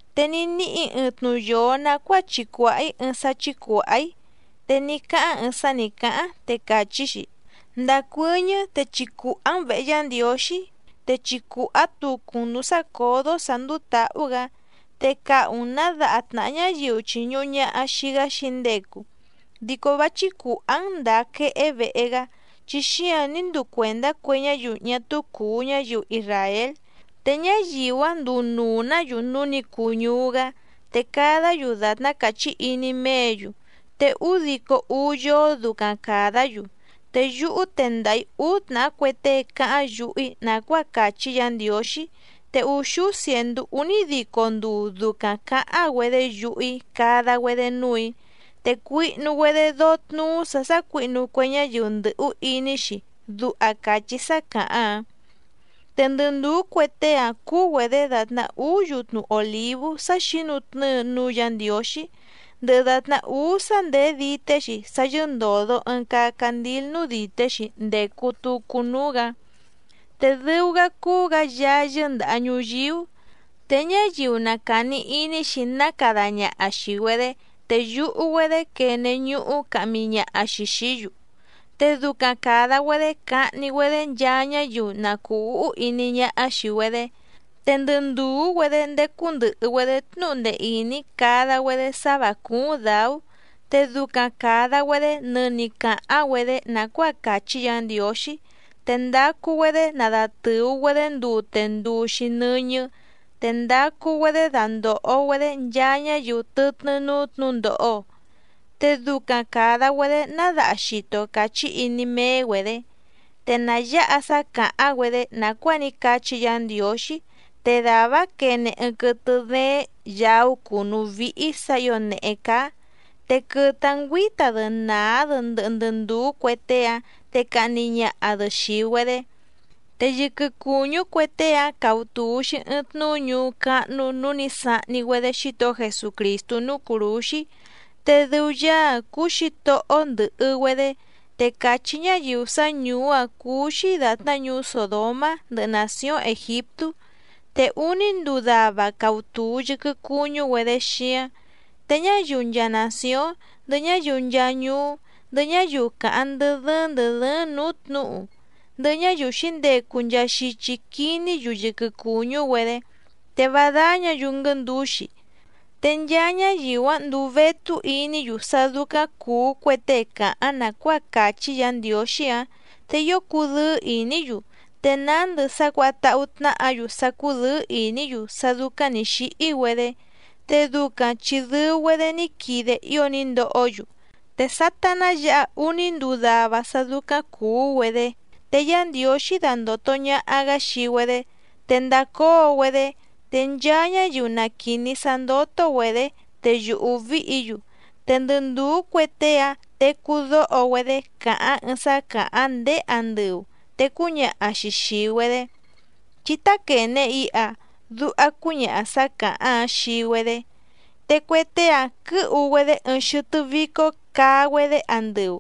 Te ní níhì‑í ɨɨⁿ tnuyoo nàcuáa chicùhá‑í ɨɨⁿ sá chícùhá‑í, te ní cáháⁿ ɨɨⁿ sá nǐ cáháⁿ, te càchí‑xi: —Ndacuɨ́ñɨ́ te chicùhá‑n vèhe Yá Ndiǒxí, te chicùhá tucu‑n nǔú sácǒdó sǎ ndúú tǎhú‑gǎ, te cahu‑n nǎ daha tnàhá ñáyiu chìñuhu ñaha xii‑gá xǐndecu. Dico vá chícùhá‑n ndàa quehé vehe‑gá, chi xíáⁿ nǐ nduu cuèndá cue ñáyiu ñá túú cùu ñáyiu isràél, te ñáyiu‑áⁿ nduu nuu‑nǎ‑yu núú nǐ cuu ñuú‑gá, te cadá‑yu dàtná càchí iní méě‑yu, te údico úú yóó ducaⁿ càdá‑yu. Te yúhú tendaha‑ǐ úú tnàhá cue tée cáháⁿ yuhu‑í nàcuáa càchí Yǎ Ndiǒxí, te úxúú cièndú únídico nduu ducaⁿ cǎháⁿ‑güedé yuhu‑í cada‑güedé núù‑í, te cuihnu‑güedé dóó tnúú sǎ sácuǐhnu cue ñáyiu ndɨ̀hú iní‑xi —duha càchí sá càháⁿ‑áⁿ. Te ndɨ ndùú cue tée‑áⁿ cúú‑güedě dàtná úú yutnu òlívú sá xǐnutnɨ́ɨ núú Yǎ Ndiǒxí, ndɨhɨ dàtná úú sá ndèé dité‑xi, sá yɨ́ndòdo ɨɨⁿ caa candíl núú dìté‑xi ndècu tucu núú‑gǎ, te dɨu‑gá cúú‑gǎ Yaá yɨ́ndàha ñuyíú. Te ñáyiu na càni iní‑xi ná cada ñaha xìi‑güedé te yuhu‑güedé quene ñuhú cahmi ñaha‑xi xìí‑yu, te ducaⁿ càda‑güedé cahni‑güedé nchaa ñáyiu na cùu úhú iní ñáhá xìi‑güedé. Te ndɨ ndùú‑güedé ndécú ndɨ̀hɨ‑güedé tnúhu ndee ìní cada‑güedé sá vǎ cúúⁿ dǎú, te ducaⁿ càda‑güedé nɨni cǎháⁿ‑güedé nàcuáa càchí Yǎ Ndiǒxí, te ndacu‑güedé nadatɨ̀u‑güedé ndute nduu‑xi nɨ́ñɨ́, te ndacu‑güedé dandòho‑güedé nchaa ñáyiu tɨtnɨ́ núú tnǔhu ndòho, te ducaⁿ càda‑güedé ná daha xito càchí iní méé‑güedě. Te nà yáha sá cǎháⁿ‑güedé nàcuáa ní cachí Yǎ Ndiǒxí, te dàvá‑áⁿ quene ɨɨⁿ quɨtɨ dééⁿ yàú cùnú víhí sǎ ǐo nèhé cáá, te quɨtɨ‑áⁿ ngüǐta‑dɨ nàá‑dɨ ndɨhɨ ndɨ ndùú cue tée‑áⁿ te cahni ñaha‑dɨ xìi‑güedé. Te yɨquɨ cùñú cue tée‑áⁿ cautùu‑xi ɨɨⁿ tnuú ñuú cáhnú nǔu ní sahni‑güedé Xítohó Jesucrìstú núú cùrúxí, te dɨu Yaá‑áⁿ cúú Xǐtohó‑ó ndɨ̀hɨ‑güedé, te càchí ñáyiu sá ñùú‑áⁿ cúú‑xí dàtná ñuú Sòdomá ndɨhɨ nàcióⁿ Ègiptú. Te úní nduu dava cautùu yɨquɨ cuñú‑güedé xíáⁿ, te ñáyiu nchaa nàcióⁿ, ndɨhɨ ñáyiu nchaa ñuú, ndɨhɨ ñáyiu càháⁿ ndɨ́ dɨ́ɨ́ⁿ ndɨ̀ dɨ́ɨ́ⁿ nǔú tnǔhu, ndɨhɨ ñáyiu xǐndecu nchaa xichi quiní‑yu yɨquɨ cùñú‑güedé, te vá dáñǎ‑yu nguɨ́ndǔxi. Te nchaa ñáyiu‑áⁿ nduu vétú iní‑yu sá dúcáⁿ cùú cue tée cáháⁿ nàcuáa càchí Yǎ Ndiǒxí‑áⁿ, te ío cudɨ́ɨ́ ìní‑yu, te nándɨ sá cuǎha táhú tnáhǎ‑yu sá cúdɨ̌ɨ́ ìní‑yu sá dúcáⁿ nǐ xíhí‑güedé, te ducaⁿ chi dɨu‑güedé ní quide ío ní ndohó‑yu. Te sátá ná yǎhá úní nduu dava sá dúcáⁿ cùú‑güedé te Yá Ndiǒxí dandòto ñaha‑gá xii‑güedé, te ndacóo‑güedé, te nchaa ñáyiu na quìní sá ndótó‑güedě te yùhú víhǐ‑yu. Te ndɨ ndùú cue tée‑áⁿ tecú dóho‑güedé cáháⁿ ɨɨⁿ sá càháⁿ ndéé andɨu, te cúñaha‑xi xìi‑güedé: —Chí táquène iha —duha cúñaha sǎ càháⁿ‑áⁿ xii‑güedé. Te cue tée‑áⁿ quɨ̌hu‑güedé ɨɨⁿ xɨtɨ́ vícó caa‑güedé andɨu,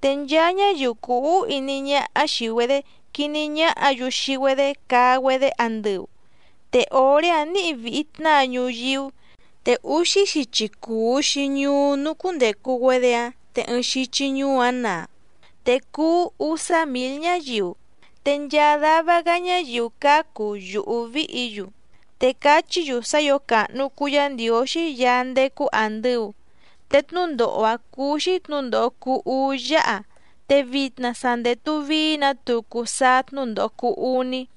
te nchaa ñáyiu cùu úhú iní ñáhá xìi‑güedé quiní ñáhǎ‑yu xii‑güedé caa‑güedé andɨu. Te òré‑áⁿ nǐhi vìhi tnáa ñuyíú, te úxí xichi cùu‑xi ñuú núú cúndècu‑güedé‑áⁿ te ɨɨⁿ xichi ñuú‑áⁿ naa, te cuú úsá mǐl ñáyiu, te nchaa dava‑gá ñáyiu cácu vá cùú yùhú víhǐ‑yu, te cachí‑yu sá ǐo càhnu cuu Yá Ndiǒxí Yaá ndécú àndɨu. Te tnúndòho‑a cuu‑xi tnúndòho cuu úú yáha, te vitna sa ndètu vií‑nǎ tucu sáá tnúndòho cuu uní.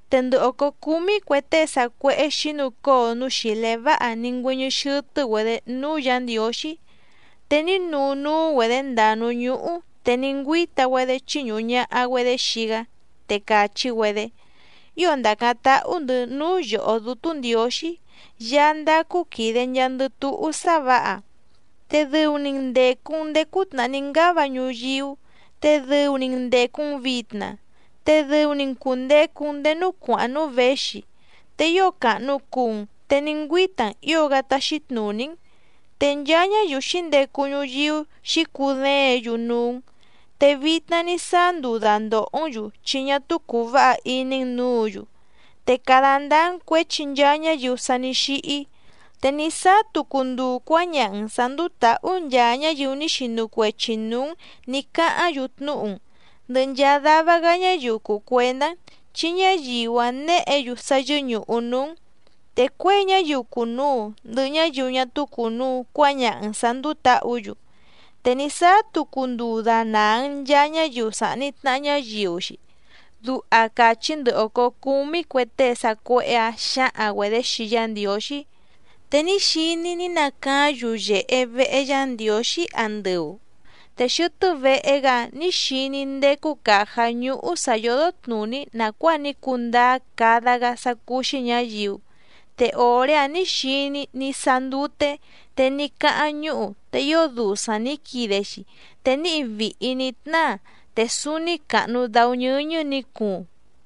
Te ndɨ òcó cúmí cue tée sacuéhé xǐnucóo núú xìlé váha ní ngüɨ́ñɨ́ xɨ́tɨ́‑güedě núú Yǎ Ndiǒxí, te ní nuu núú‑güedě ndàa núú ñúhú te ní ngüíta‑güedé chíñùhu ñaha‑güedé xii‑gá, te càchí‑güedé: Ío ndàcáⁿ táhú‑ndɨ̌ núú yòhó Dútú Ndiǒxí, Yaá ndácú quìde nchaandɨ túhú sá vǎha, te dɨu‑ni‑n ndècu‑n ndéé cútnàhá ní ngáva ñuyíú, te dɨu‑ni‑n ndècu‑n vitna, te dɨu‑ni‑n cùndecu‑n ndéé núú cuàháⁿ núú věxi, te ío càhnu cuu‑n te ní ngüíta‑n ǐo‑gá táxí tnùní‑n. Te nchaa ñáyiu xǐndecu ñuyíú xǐcudéěⁿ‑yu núú‑n, te vitna ní sáá nduu dàndohó‑n‑yu chi ñá túú cùu váha iní‑n nǔǔ‑yu, te cada ndáá‑n cuěchi nchaa ñáyiu sa ní xíhí, te ní sáá tucu nduu cuǎñaha‑n sǎ ndúú tǎhú nchaa ñáyiu ní xinu cuechi nǔú‑n nǐ cáháⁿ‑yu tnúhu‑n, ndɨhɨ nchaa dava‑gá ñáyiu cùu cuendá‑n, chi ñáyiu‑áⁿ néhě‑yu sá yɨ́ñùhu núú‑n, te cuěi ñáyiu cùnuu ndɨhɨ ñáyiu ñá túú cùnuu cuáñaha‑n sǎ ndúú tǎhǔ‑yu, te ní sáá tucu nduu dànaa‑n nchaa ñáyiu sàhni tnaha ñáyiu‑xi. Duha càchí ndɨ òcó cúmí cue tée sacuéhé‑ǎⁿ xǎhaⁿ‑güedě xii Yá Ndiǒxí. Te ní xiní‑í ní nacaáⁿ yuyèhe vehe Yá Ndiǒxí andɨu, te xɨtɨ́ vehe‑gá‑áⁿ nǐ xiní‑í ndécú càjá ñúhú sǎ yódó tnùní nàcuáa ní cundáá cada‑gá sá cúú‑xí ñǎyiu, te òré‑áⁿ nǐ xiní‑í ní sáá ndúté, te ní cáháⁿ ñúhu te ío dusaⁿ nǐ quide‑xi, te níhi vìhi ní tnáa, te súúní càhnu dáú ñɨ́ñɨ́ nǐ cuuⁿ.